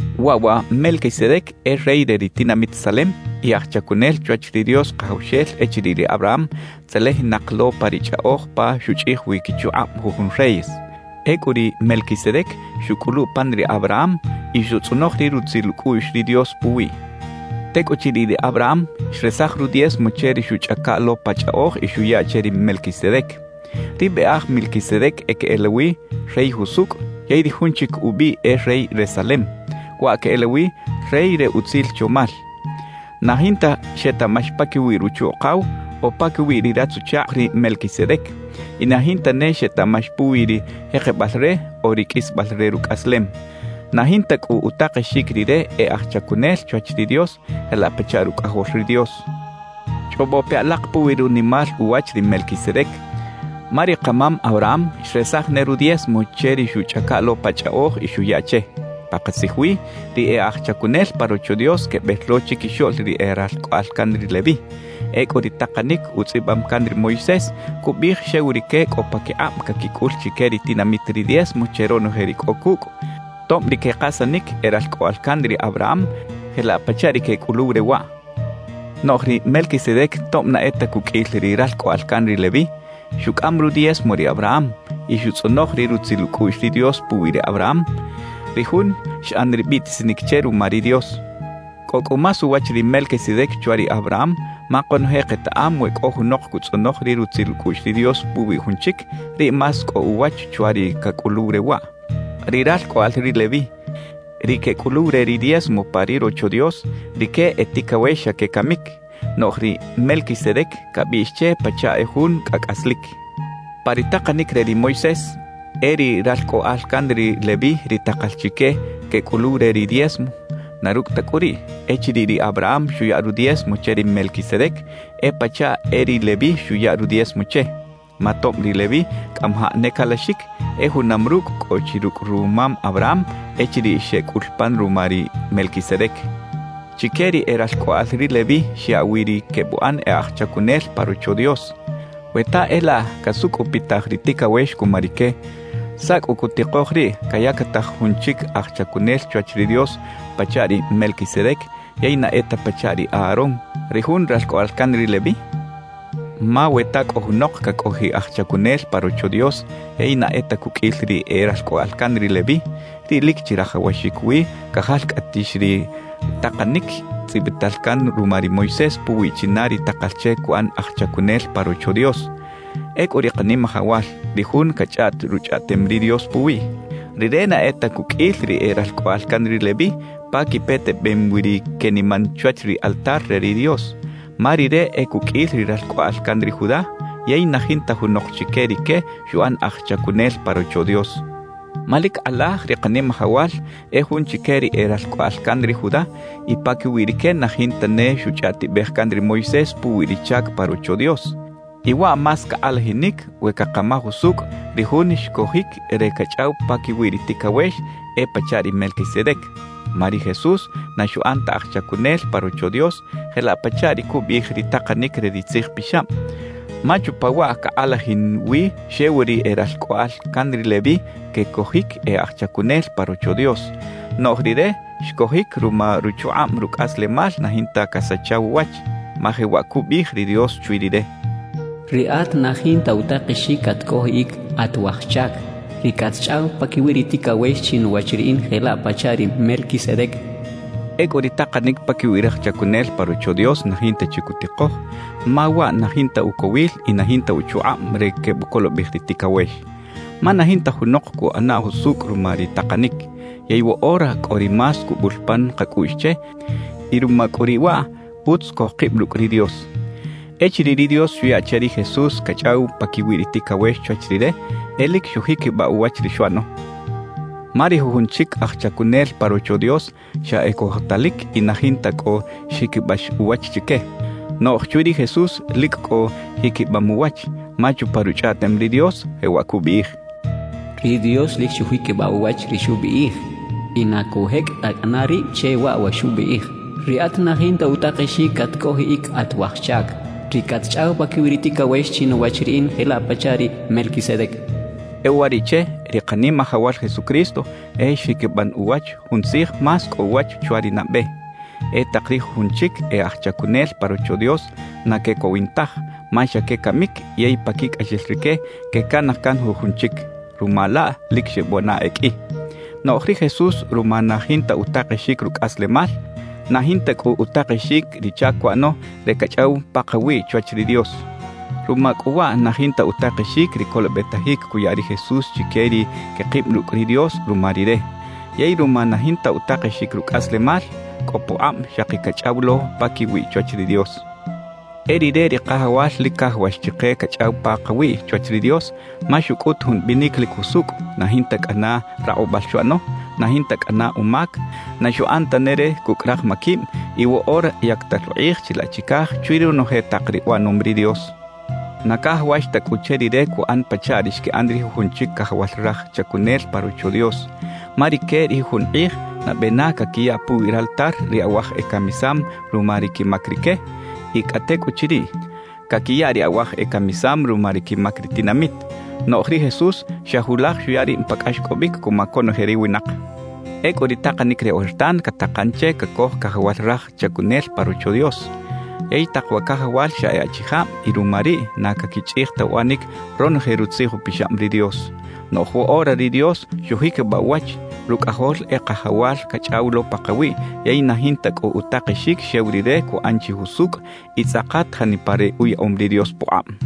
Waꞌ wa Melquisedec e rey re ri tinamit Salem y aj chacunel chwach ri Dios Kajawxel echiriꞌ ri Abraham tzelejinak lo pa ri chꞌaꞌoj pa xuchꞌij wi quichukꞌab jujun reyes. Ecꞌu ri Melquisedec xuꞌcꞌulu pan ri Abraham y xutzꞌonoj ri rutzil ucꞌuꞌx ri Dios puwiꞌ. Tecꞌuchiriꞌ ri Abraham xresaj rudiezmo che ri xuꞌchꞌaca lo pa chꞌaꞌoj y xuya che ri Melquisedec. Ri biꞌaj Melquisedec queꞌelawi: “Rey Jusucꞌ” yey ri jun chic ubiꞌ e “Rey re Salem”, waꞌ queꞌelawi: “Rey re Utzil Chomal”. Na jinta xetaꞌmax paquiwi ruchu-ukaw o paquiwi ri ratz-uchakꞌ ri Melquisedec; y na jinta ne xetaꞌmax puwi ri jekebal re o ri qꞌuisbal re rucꞌaslem. Na jinta cꞌu utakexic rire e aj chacunel chwach ri Dios jelaꞌ pachaꞌ Rucꞌajol ri Dios. Chꞌobo pe alak puwi runimal uwach ri Melquisedec, ma ri kamam Abraham xresaj ne rudiezmo che ri xuꞌchꞌaca lo pa chꞌaꞌoj y xuya che. Pakatzij wi, ri e aj chacunel pa Rocho Dios quebel lo chiquixoꞌl ri e ralcꞌoꞌal can ri Leví. Ecꞌu ri takanic utzꞌibam can ri Moisés cubiꞌij xew rique cꞌo paquikꞌab caquicꞌul chique ri tinamit ri diezmo che ronoje ri cꞌo cucꞌ, tob ri quekasanic e ralcꞌoꞌal can ri Abraham jelaꞌ pachaꞌ ri quecꞌuluw re waꞌ. Noꞌj ri Melquisedec tob na e ta cuqꞌuil ri ralcꞌoꞌal can ri Leví, xucꞌam rudiezmo ri Abraham, y xutzꞌonoj ri rutzil ucꞌuꞌx ri Dios puwi ri Abraham, ri jun xꞌan ri biꞌtisinic che ruma ri Dios. Cꞌo cꞌu más uwach ri Melquisedec chwa ri Abraham ma konoje ketaꞌam we cꞌo junok cutzꞌonoj ri rutzil ucꞌuꞌx ri Dios puwi jun chic, riꞌ más cꞌo uwach chwa ri cacꞌuluw re waꞌ. Ri ralcꞌoꞌal ri Leví, ri quecꞌuluw re ri diezmo pa ri Rocho Dios, rique e ticawex xa quecamic; noꞌj ri Melquisedec cabiꞌx che pachaꞌ e jun cꞌa cꞌaslic. Pa ri takanic re ri Moisés, e ri ralcꞌoꞌal can ri Leví ri takal chique quecꞌuluw re ri diezmo. Na rucꞌ ta cꞌu riꞌ, echiriꞌ ri Abraham xuya rudiezmo che ri Melquisedec, e pachaꞌ e ri Leví xuya rudiezmo che; ma tob ri Leví cꞌamajaꞌ ne calaxic, e junam rucꞌ cꞌo chi rucꞌ rumam Abraham echiriꞌ xeꞌcꞌul pan ruma ri Melquisedec. Chique ri e ralcꞌoꞌal ri Leví xyaꞌ wi ri quebuꞌan e aj chacunel pa Rocho Dios. We ta e laꞌ casucꞌupitaj ri ticawex cuma rique, ¿saꞌ cꞌu cutikoj riꞌ cayactaj jun chic aj chacunel chwach ri Dios pachaꞌ ri Melquisedec, yey na e ta pachaꞌ ri Aarón, ri jun ralcꞌoꞌal can ri Leví? Ma we ta cꞌo junok cacꞌojiꞌ aj chacunel pa Rocho Dios yey na e ta cuqꞌuil ri e ralcꞌoꞌal can ri Leví, riꞌ lic chirajawaxic wi cajalcꞌatix ri takanic tzꞌibital can ruma ri Moisés puwi china ri takal che cuꞌan aj chacunel pa Rocho Dios. Ecꞌu ri Kanimajawal, ri Jun cachꞌaꞌt Ruchꞌaꞌtem ri Dios puwiꞌ, Rire na e ta cuqꞌuil ri e ralcꞌoꞌal can ri Leví pa quipetebem wi ri queniman chwach ri altar re ri Dios. Ma Rire e cuqꞌuil ri ralcꞌoꞌal can ri Judá, yey na jinta junok chique rique xuꞌan aj chacunel pa Rocho Dios. Ma lic kꞌalaj ri Kanimajawal e jun chique ri e ralcꞌoꞌal can ri Judá y paquiwi rique na jinta ne xuchꞌaꞌtibej can ri Moisés puwi ri chac pa Rocho Dios. Y waꞌ más cakꞌalajinic we cakamaj usucꞌ, ri Jun xcojic re cachꞌaw paquiwi ri ticawex, e pachaꞌ ri Melquisedec. Ma ri Jesús na xuꞌan ta aj chacunel pa Rocho Dios jelaꞌ pachaꞌ ri cubiꞌij ri takanic re ri Tzij Pixab; ma chupa waꞌ cakꞌalajin wi xew ri e ralcꞌoꞌal can ri Leví quecojic e aj chacunel pa Rocho Dios, noꞌj Rire xcojic ruma ruchukꞌab rucꞌaslemal na jinta casachaw uwach. Ma jewaꞌ cubiꞌij ri Dios chwi Rire: Riꞌat na jinta utakexic catcꞌojiꞌic at waj chac, ri catchꞌaw paquiwi ri ticawex chinuwach Riꞌin jelaꞌ pachaꞌ ri Melquisedec cachaꞌ. Ecꞌu ri takanic paquiwi raj chacunel pa Rocho Dios na jinta chi cutikoj, ma waꞌ na jinta ucowil y na jinta uchukꞌab re quebucolobej ri ticawex. Ma na jinta junok cuꞌana jusucꞌ ruma ri takanic. Yey woꞌora cꞌo ri más cubul pan kacꞌuꞌx che, y ruma cꞌu riꞌ waꞌ, utz cojkib rucꞌ ri Dios. Echiriꞌ ri Dios xuya che ri Jesús cachꞌaw paquiwi ri ticawex chwach Rire, e lic xujiquibaꞌ uwach ri xuꞌano. Ma ri jujun chic aj chacunel pa Rocho Dios xa e cojotalic y na jinta cꞌo xjiquibax uwach chique. Noꞌj chwi ri Jesús lic cꞌo jiquibam uwach, ma chupa Ruchꞌaꞌtem ri Dios, jewaꞌ cubiꞌij: Ri Dios lic xujiquibaꞌ uwach ri xubiꞌij, y na cujecꞌ ta cꞌana rib che waꞌ wa xubiꞌij: “Riꞌat na jinta utakexic catcꞌojiꞌic at waj chac, ri catchꞌaw paquiwi ri ticawex chinuwach Riꞌin jelaꞌ pachaꞌ ri Melquisedec.” E uwariꞌche, ri Kanimajawal Jesucristo e xjiquiban uwach jun Tzij más cꞌo uwach chwa ri nabe. E tak ri jujun chic e aj chacunel pa Rocho Dios na quecowin taj, ma xa quecamic yey paquicꞌaxel rique quecanaj can jujun chic. Ruma laꞌ lic xebuꞌana e qꞌui. Noꞌj ri Jesús ruma na jinta utakexic rucꞌaslemal, na jinta cꞌu utakexic ri chac cuꞌano re cachꞌaw pakawiꞌ chwach ri Dios. Ruma cꞌu waꞌ na jinta utakexic ri colobetajic cuya ri Jesús chique ri quekib rucꞌ ri Dios ruma Rire. Yey ruma na jinta utakexic rucꞌaslemal, cꞌo pukꞌab xaki cachꞌaw lo paquiwiꞌ chwach ri Dios. E Rire ri Kajawal lic cajawax chike cachꞌaw pakawiꞌ chwach ri Dios, ma xucꞌut jun binic lic jusucꞌ, na jinta cꞌana rakꞌubal xuꞌano, na jinta cꞌana umac, na xuꞌan tane re cucꞌ raj maquib y woꞌora yactal ukꞌij chilaꞌ chicaj chwi ronoje tak ri uꞌanom ri Dios. Na cajawax ta cꞌu che Rire cuꞌan pachaꞌ ri xquiꞌan ri jujun chic cajawal raj chacunel pa Rocho Dios. Ma rique ri jujun kꞌij, nabe na caquiya puwi raltar ri awaj ecamisam ruma ri quimac rique, y cꞌa tecꞌuchiriꞌ, caquiya ri awaj ecamisam ruma ri quimac ri tinamit. Noꞌj ri Jesús xa julaj xuya rib pa cꞌaxcꞌobic cuma conoje ri winak. Ecꞌu ri takanic re ojertan catakan che cacoj cajawal raj chacunel pa Rocho Dios. Yey tak wa cajawal xa e achijab y ruma riꞌ na caquichꞌij ta uꞌanic ronoje Rutzij Upixab ri Dios. Noꞌj woꞌora ri Dios xujiquibaꞌ uwach, Rucꞌajol e Kajawal cachꞌaw lo pakawiꞌ yey na jinta cꞌu utakexic xew Rire cuꞌan chi jusucꞌ y tzꞌakat janipa ri uyaꞌom ri Dios pukꞌab.